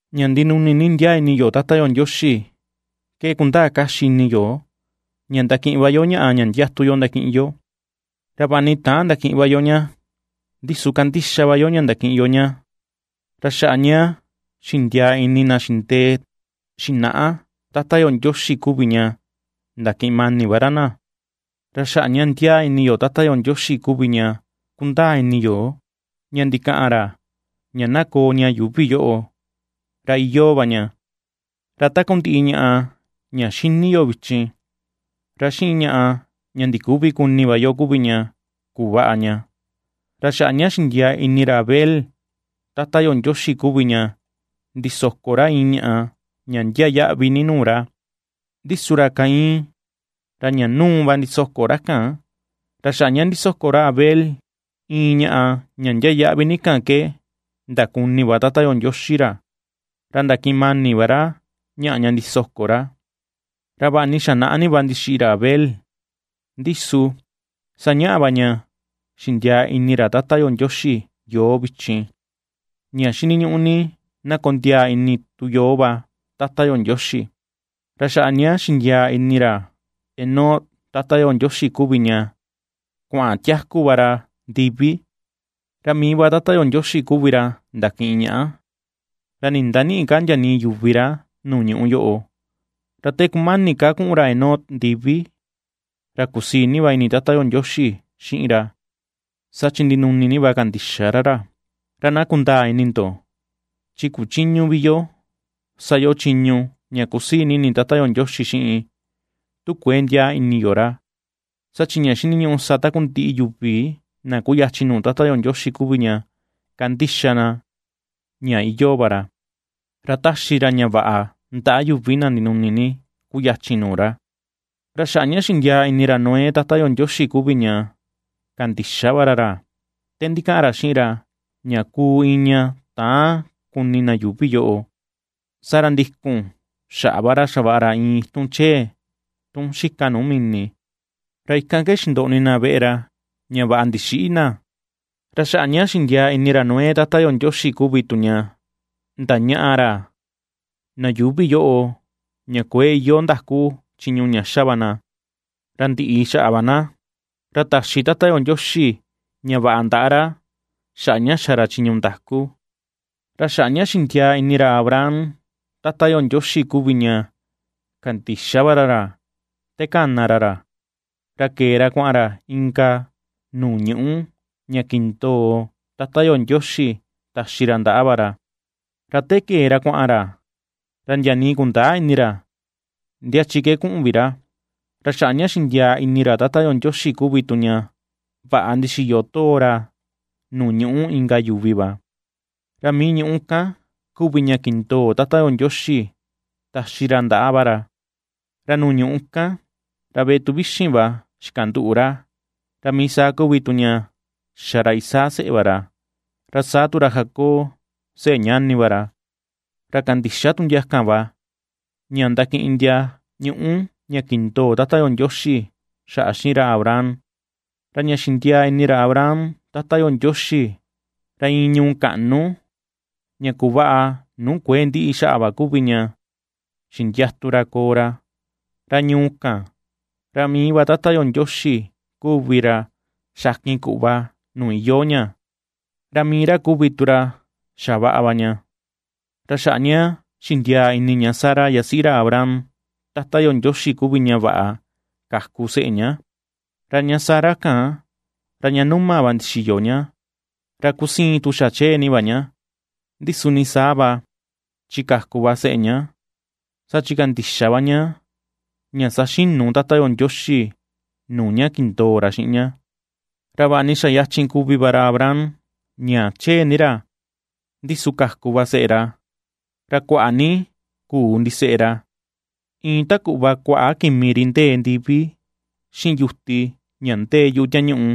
Ña ndinuni ni ndiaa ini yo Tata yo Ndioxi ke kundaa kaxi ini yo ña ndakiꞌin va yo ñaꞌa ña ndiatu yo ndakiꞌin yo; ra vaꞌa ni täan ndakiꞌin va yo ña, ndi su kandixa va yo ña ndakiꞌin yo ña. Ra xaꞌa ña xindiaa ini na xindee xinaꞌa Tata yo Ndioxi kuvi tu ña ndakiꞌin mani va ra na. Ra xaꞌa ña ndiaa ini yo Tata yo Ndioxi kuvi ña kundaa ini yo ña ndikaꞌan ra ña na koo ña yuuvi yoꞌo, ra iyoo va ña, ra takundiꞌi ñaꞌa ña ^xini yo vichin, ra xiꞌin ñaꞌa ña ndiküvi kuni va yo kuvi ña kuvaꞌa ña. Ra xaꞌa ña xindiaa ini ra Abel Tata yo Ndioxi kuvi ña ndisoko ra iin ñaꞌa ña ndiaa yaꞌvi ni nuu ra, ndi su ra Caín, ra ña nuu va ndisoko ra kan; ra xaꞌa ña ndisoko ra Abel iin ñaꞌa ña ndiaa yaꞌvi ni kan ke ndakuni va Tata yo Ndioxi ra, ra ndakiꞌin mani va ra ñaꞌa ña ndisoko ra. Ra vaꞌa ni xa naꞌa ni va ndixiꞌi ra Abel, ndi su sañaꞌa va ña xindiaa ini ra Tata yo Ndioxi yoo vichin, ña xiniñuꞌu ni na kondiaa ini tu yoo va Tata yo Ndioxi. Ra xaꞌa ña xindiaa ini ra Enoc Tata yo Ndioxi kuvi ña kuaꞌan tiaku va ra ndivi, ra mii va Tata yo Ndioxi kuvi ra ndakiꞌin ñaꞌa, ra nindanïꞌi ka ndia nii yuvi ra nuu ñuꞌu yoꞌo. Ra te kumani ka kuꞌun ra Enoc ndivi, ra kusii ni va ini Tata yo Ndioxi xiꞌin ra, saa chi ndinuni ni va kandixa ra ra. Ra na kundaa ini ndo, chi kuchïñu vi yo sa yo chiñu ña ^kusii ini Tata yo Ndioxi xiꞌin tu kuëe ndiaa ini yo ra, saa chi ña xiniñuꞌu sa takundiꞌi yuvi na kuyachin nuu Tata yo Ndioxi kuvi ña kandixa na ña iyoo va ra, ra ^taxi ra ña vaꞌa ndaꞌa yuvi na ndinuni ni kuyachin nuu ra. Ra xaꞌa ña xindiaa ini ra Noé Tata yo Ndioxi kuvi ña kandixa va ra ra te ndikaꞌan ra xiꞌin ra ña kuu iin ña täan kuni na yuuvi yoꞌo, saa ra ndikun xaꞌa va ra xavaꞌa ra iin itun chee tun xika nuu mini, ra ikan ke xindoꞌni na veꞌe ra ña vaꞌa ndixïꞌi na. Ra xaꞌa ña xindiaa ini ra Noé Tata yo Ndioxi kuvi tu ña ndañaꞌa ra na yuuvi yoꞌo ña kuëe iyoo ndaku chiñu ña xa va na, ra ndiꞌi xaꞌa va na, ra taxi Tata yo Ndioxi ña vaꞌa ndaꞌa ra xaꞌa ña xa ra chiñu ndaku. Ra xaꞌa ña xindiaa ini ra Abraham Tata yo Ndioxi kuvi ña kandixa va ra ra te kana ra ra, ra kee ra kuaꞌan ra inka nuu ñuꞌu ña kindoo Tata yo Ndioxi taxi ra ndaꞌa va ra. Ra te kee ra kuaꞌan ra, ra ndia nii kundäa ini ra ndia chi ke kuaꞌan vi ra. Ra xaꞌa ña xindiaa ini ra Tata yo Ndioxi kuvi tu ña vaꞌa ndixiyo too ra nuu ñuꞌu inka yuvi va, ra mii ñuꞌu kan kuvi ña kindoo Tata yo Ndioxi taxi ra ndaꞌa va ra. Ra nuu ñuꞌu kan, ra veꞌe tuvixin va xikanduꞌu ra, ra mii sa kuvi tu ña xa ra Isaac seꞌe va ra, ra saa tu ra Jacob seꞌe ñani va ra, ra kandixa tu ndia kan va ña ndakiꞌin ndia ñuꞌu ña kindoo Tata yo Ndioxi xaꞌa xiꞌin ra Abraham. Ra ña xindiaa ini ra Abraham Tata yo Ndioxi, ra iin ñuu kaꞌnu ña kuvaꞌa nuu kuë ndiꞌi xaꞌa va kuvi ña xindiatu ra koo ra. Ra ñuu kan, ra mii va Tata yo Ndioxi kuvi ra xakin kuꞌva nuu iyoo ña, ra mii ra kuvi tu ra xavaꞌa va ña. Ra xaꞌa ña xindiaa ini ña Sara yasiꞌi ra Abraham Tata yo Ndioxi kuvi ña vaꞌa kaku seꞌe ña; ra ña Sara kan, ra ña numa va ndixiyo ña, ra kusiin tu xa chee ni va ña, ndi su nii saa va chi kaku va seꞌe ña. Saa chi kandixa va ña, ña saxinu Tata yo Ndioxi nuu ña kindoo ra xiꞌin na. Ra vaꞌa ni xa yachin kuvi va ra Abraham ña chee ni ra, ndi su kaku va seꞌe ra, ra kuaꞌa ni kuu ndiseꞌe ra, iin ta kuꞌva kuaꞌa kimi ri ndee ndivi xiꞌin yuti ña ndee yuꞌu tiañuꞌu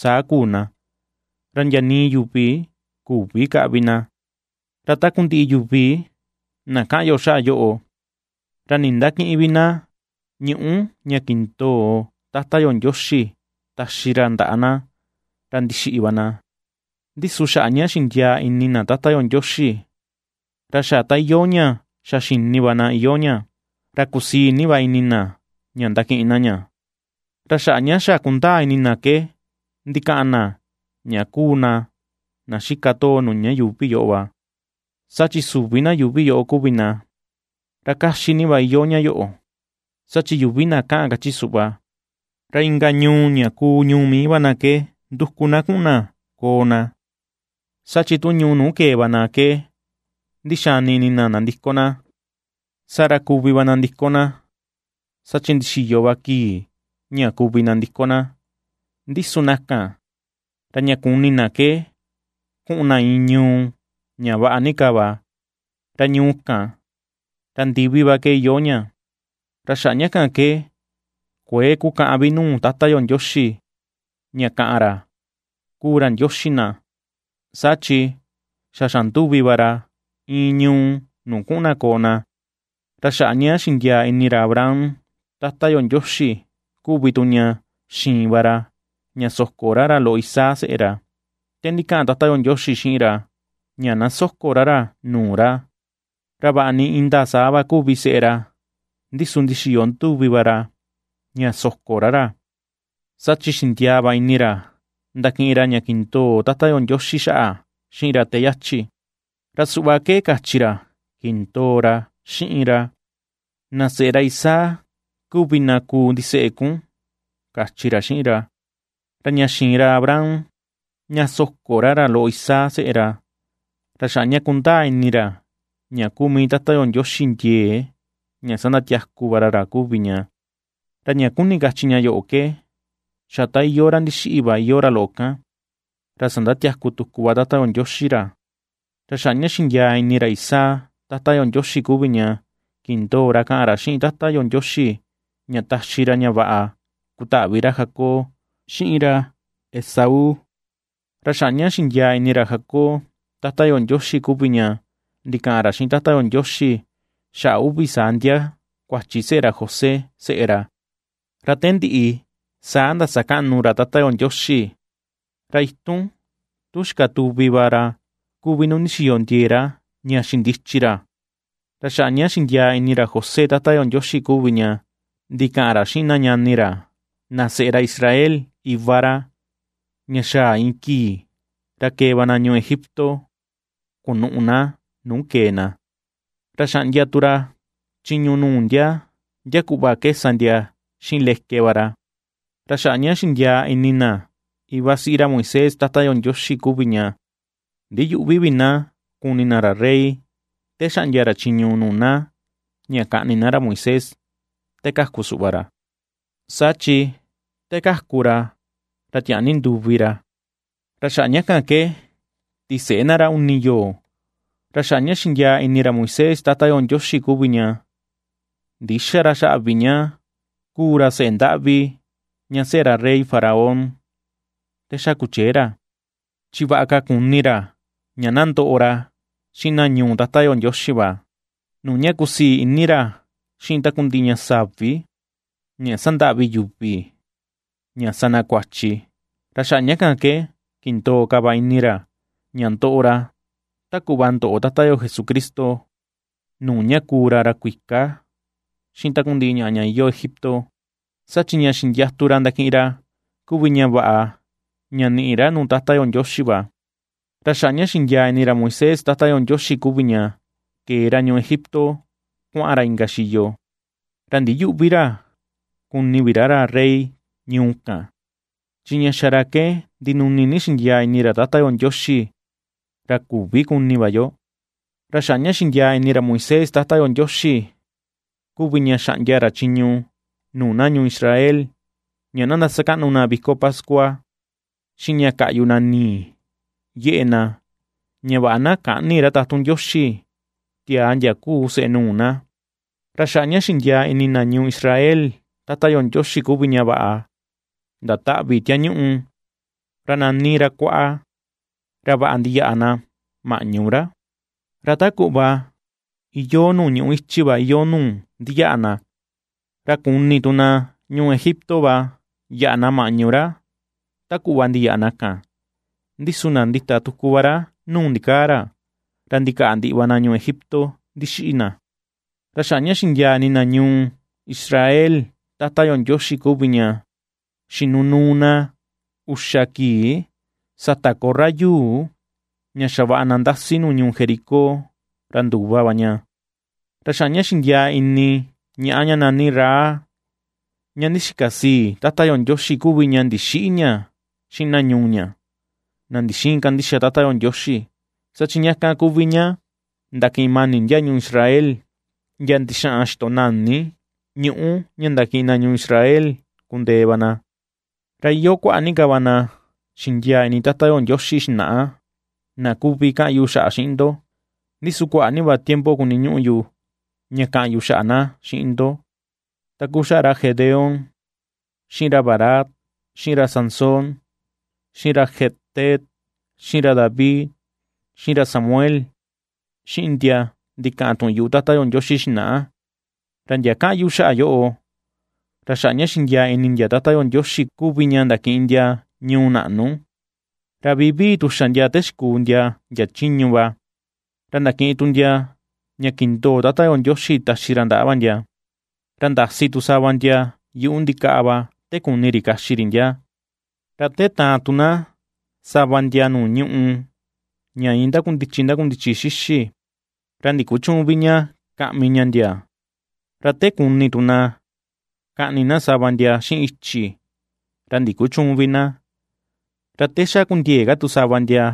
saa kuu na, ra ndia nii yuvi ^küvi kaꞌvi na. Ra takundiꞌi yuvi na kaꞌan yo xaꞌa yoꞌo, ra nindakïꞌin vi na ñuꞌú ña kindoo Tata yo Ndioxi taxi ra ndaꞌa na, ra ndixiꞌi va na; ndi su xaꞌa ña xindiaa ni ini na Tata yo Ndioxi, ra xa ta iyoo ña xa xini va na iyoo ña, ra kusii ni va ini na ña ndakiꞌin na ña. Ra xaꞌa ña xa ^kundaa ini na ke ndikaꞌan na ña kuu na na xika too nuu ña yuuvi yoꞌo va, saa chi süvi na yuuvi yoꞌo kuvi na. Ra kaxi ni va iyoo ña yoꞌo, saa chi yuvi na kaꞌan kachi suꞌva, ra inka ñuu ña kuu ñuu mii va na ke nduku na kuꞌun na koo na. Saa chi tu ñuu nuu kee va na ke ndixani ini na nandiko na, saa ra kuvi va nandiko na saa chi ndixiyo va kii ña kuvi nandiko na. Ndi su na kan, ra ña kuni na ke kuꞌun na iin ñuu ña vaꞌa ni ka va, ra ñuu kan, ra ndivi va ke iyoo ña. Ra xaꞌa ña kan ke kuëe kukaꞌan vi nuu Tata yo Ndioxi ña ^kaꞌan ra kuu ra Ndioxi na, saa chi xa xanduvi va ra iin ñuu nuu kuꞌun na koo na. Ra xaꞌa ña xindiaa ini ra Abraham Tata yo Ndioxi kuvi tu ña xiin va ra ña soko ra ra loꞌo Isaac seꞌe ra. Te ndikaꞌan Tata yo Ndioxi xiꞌin ra ña na soko ra ra nuu ra, ra vaꞌa ni indaa saa va kuvi seꞌe ra, ndi su ndixiyo nduvi va ra ña soko ra ra, saa chi xindiaa va ini ra ndakiꞌin ra ña kindoo Tata yo Ndioxi xaꞌa xiꞌin ra te yachi, ra suꞌva ke kachi ra kindoo ra xiꞌin ra: “Na seꞌe ra Isaac kuvi na kuu ndiseꞌe kun”, kachi ra xiꞌin ra. Ra ña xiin ra Abraham ña soko ra ra loꞌo Isaac seꞌe ra, ra xaꞌa ña kundaa ini ra ña kuu mii Tata yo Ndioxi ndiee ña sandatiaku va ra ra kuvi ña; ra ña kuni kachi ña yoꞌo ke xa ta iyoo ra ndixiꞌi va iyoo ra loꞌo kan, ra sandatiaku tuku va Tata yo Ndioxi ra. Ra xaꞌa ña xindiaa ini ra Isaac Tata yo Ndioxi kuvi ña kindoo ra kaꞌan ra xiꞌin Tata yo Ndioxi ña taxi ra ña vaꞌa kutaꞌvi ra Jacob xiꞌin ra Esaú. Ra xaꞌa ña xindiaa ini ra Jacob Tata yo Ndioxi kuvi ña ndikaꞌan ra xiꞌin Tata yo Ndioxi xaꞌa uvi saa ndia kuachi seꞌe ra José seꞌe ra. Ra te ndiꞌi saa ndasakaꞌnu ra Tata yo Ndioxi, ra itun tun xikatuvi va ra kuvi nu ndixiyo ndiee ra ña xindichi ra. Ra xaꞌa ña xindiaa ini ra José Tata yo Ndioxi kuvi ña ndikaꞌan ra xiꞌin na ñani ra na seꞌe ra Israel iva ra, ña xaa iin kii ra kee va na ñuu Egipto kunuꞌu na nuu kee na, ra xaꞌndia tu ra chiñu nuu na ndia kuꞌva ke sa na xiꞌin leke va ra. Ra xaꞌa ña xindiaa ini na iva siꞌi ra Moisés Tata yo Ndioxi kuvi ña ndiyüꞌvi vi na kuni na ra rey te xaꞌndia ra chiñu nuu na ña kaꞌni na ra Moisés te kaku suꞌva ra, saa chi te kaku ra ra tiaa ni nduvi ra, ra xaꞌa ña kan ke tiseꞌe na ra uni yoo. Ra xaꞌa ña xindiaa ini ra Moisés Tata yo Ndioxi kuvi ña ndïxa ra xaꞌa vi ña kuu ra seꞌe ndaꞌvi ña seꞌe rey Faraón te xa kuchee ra, chi vaꞌa ka kuni ra ña na ndoꞌo ra xiꞌin na ñuu Tata yo Ndioxi va, nuu ña kusii ini ra xiꞌin takundiꞌi ña savi, ña sandaꞌvi yuvi, ña sa na kuachi. Ra xaꞌa ña kan ke kindoo ka va ini ra ña ndoꞌo ra ta kuꞌva ndoꞌo Tata yo Jesucristo, nuu ña ^kuu ra ra kuika xiꞌin takundiꞌi ñaꞌa ña iyoo Egipto; saa chi ña xindiatu ra ndakiꞌin ra kuvi ña vaꞌa ña niꞌi ra nuu Tata yo Ndioxi va. Ra xaꞌa ña xindiaa ini ra Moisés Tata yo Ndioxi kuvi ña kee ra ñuu Egipto kuaꞌan ra inka xiyo, ra ndiyüꞌvi ra kuni vi ra ra rey ñuu kan, chi ña xa ra ke ndinuni ni xindiaa ini ra Tata yo Ndioxi, ra küvi kuni va yo. Ra xaꞌa ña xindiaa ini ra Moisés Tata yo Ndioxi kuvi ña xaꞌndia ra chiñu nuu na ñuu Israel ña na ndasakaꞌnu na viko pascua, xiꞌin ña kaꞌyu na nii yeꞌe na ña vaꞌa na käꞌni ra tatun Ndioxi, tiaa ndia kuu seꞌe nuu na. Ra xaꞌa ña xindiaa ini na ñuu Israel Tata yo Ndioxi kuvi ña vaꞌa ndataꞌvi tiañuꞌu, ra nani ra Kuaꞌa, ra vaꞌa ndiyaꞌa na maꞌñu ra, ra ta kuꞌva iyoo nuu ñuꞌu ichi va iyoo nuu ndiyaꞌa na; ra kuni tu na ñuu Egipto va yaꞌa na maꞌñu ra ta kuꞌva ndiyaꞌa na kan, ndi su ndandita tuku va ra nuu ndikaa ra, ra ndikaꞌa ndiꞌi va na ñuu Egipto ndixiꞌi na. Ra xaꞌa ña xindiaa ini na ñuu Israel Tata yo Ndioxi kuvi ña xinunuu na uxa kii, sata korra yuu ña xavaꞌa na ndasi nuu ñuu Jericó ra nduva va ña. Ra xaꞌa ña xindiaa ini ñaꞌa ña nani Rahab, ña ndixika sii, Tata yo Ndioxi kuvi ña ndixïꞌi ña xiꞌin na ñuu ña, na ndixïin kandixa Tata yo Ndioxi, saa chi ña kan kuvi ña ndakiꞌin mani ndia ñuu Israel ndia ndixaꞌan xitonani ñuꞌu ña ndakiꞌin na ñuu Israel kundee va na. Ra iyoo kuaꞌa ni ka va na xindiaa ini Tata yo Ndioxi xinaꞌa na kuvi kaꞌan yu xaꞌa xiꞌin ndo, ndi su kuaꞌa ni va tiempo kuniñuꞌu yu ña kaꞌan yu xaꞌa na xiꞌin ndo, ta kuu xaꞌa ra Gedeón, xiꞌin ra Barac, xiꞌin ra Sansón, xiꞌin ra Jefté, xiꞌin ra David, xiꞌin ra Samuel, xiꞌin ndia ndikaꞌan tuꞌun yuꞌu Tata yo Ndioxi xinaꞌa. Ra ndia kaꞌan yu xaꞌa yoꞌo, ra xaꞌa ña xindiaa ini ndia Tata yo Ndioxi va kuvi ña ndakiꞌin ndia ñuu naꞌnu, ra vivii tu xa ndia te xikuu ndia ndia chiñu va, ra ndakiꞌin tu ndia ña kindoo Tata yo Ndioxi taxi ra ndaꞌa va ndia, ra ndasi tu sava ndia yuꞌu ndikaꞌa va te kuni ri kaxi ri ndia, ra te taan tu na sava ndia nuu ñùꞌù ña iin ndakundichi ndakundichi xixi, ra ndikuchüun vi ña kaꞌmi ña ndia, ra te kuni tu na kaꞌni na sava ndia xiꞌin ichi, ra ndikuchüun vi na. Ra te xa kundiëe ka tu sava ndia,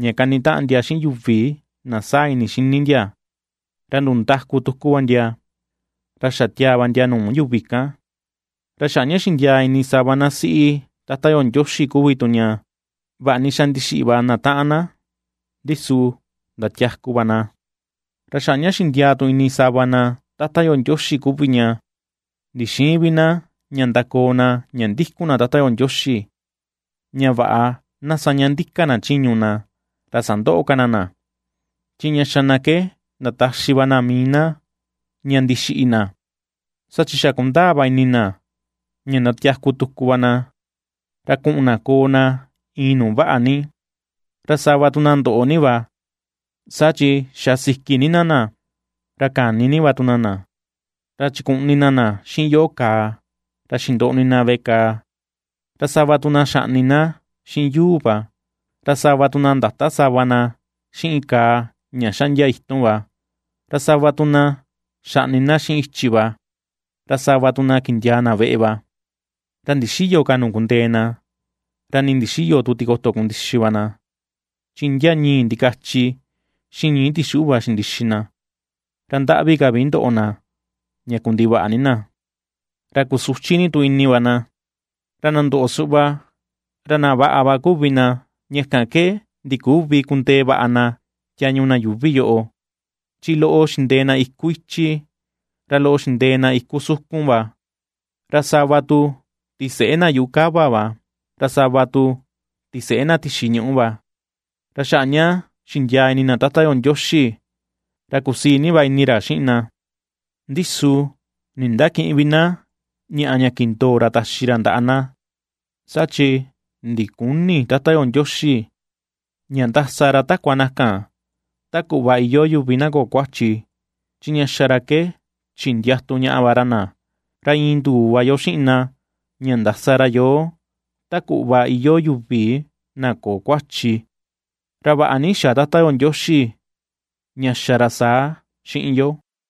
ña kanitaꞌan ndia xiꞌin yuvi na saa ini xini ndia, ra nduu ndaku tuku va ndia, ra xa tiaa va ndia nuu yuvi kan. Ra xaꞌa ña xindiaa ini sava na siꞌi Tata yo Ndioxi kuvi tu ña vaꞌa ni xa ndixiꞌi va na taꞌan na, ndi su ndatiaku va na. Ra xaꞌa ña xindiaa tu ini sava na Tata yo Ndioxi kuvi ña ndixïin vi na ña ndakoo na ña ndikun na Tata yo Ndioxi, ña vaꞌa na ^saña ndika na chiñu na, ra sandöꞌo ka na na. Chi ña xa na ke ndataxi va na mii na ña ndixiꞌi na, saa chi xa kundaa va ini na ña ndatiaku tuku va na, ra kuꞌun na koo na iin nuu vaꞌa ni. Ra sava tu na ndoꞌo ni va, saa chi xa siki ni na na, ra kani ni va tu na na, ra chikuꞌni na xiꞌin yoꞌo kàà, ra xindoꞌni na veꞌe kàà. Ra sava tu na xaꞌni na xiꞌin yuu va, ra sava tu na ndata sava na xiꞌin kàà ña xaꞌndia itun va, ra sava tu na xaꞌni na xiꞌin ichi va; ra sava tu na kindiaa na veꞌe va, ra ndixïyo ka nuu kundee na, ra ni ndixïyo tu tikoto kundixi va na, chi ndia ñii̱ ndikachi xiꞌin ñii̱ tixuꞌu va xindixi na, ra ndaꞌvi ka vi ndoꞌo na ña kundivaꞌa ni na, ra kusuchi ni tu ini va na. Ra na ndoꞌo suꞌva, ra na vaꞌa va kuvi na ña kan ke ndiküvi kundee vaꞌa na tiañu na yuuvi yoꞌo. Chi loꞌo xindee na iku ichi, ra loꞌo xindee na iku sukun va, ra sava tu tiseꞌe na yuꞌu kava va, ra sava tu tiseꞌe na tixi ñuꞌu va. Ra xaꞌa ña xindiaa ini na Tata yo Ndioxi, ra kusii ni va ini ra xiꞌin na, ndi su nindakïꞌin vi na ñaꞌa ña kindoo ra taxi ra ndaꞌa na; saa chi ndiküni Tata yo Ndioxi ña ndasa ra takua na kan, ta kuꞌva iyoo yuvi na köo kuachi, chi ña xa ra ke chindiatu ñaꞌa va ra na, ra iin nduu va yo xiꞌin na ña ndasa ra yoo ta kuꞌva iyoo yuvi na köo kuachi. Ra vaꞌa ni xa Tata yo Ndioxi ña xa ra saa xiꞌin yo.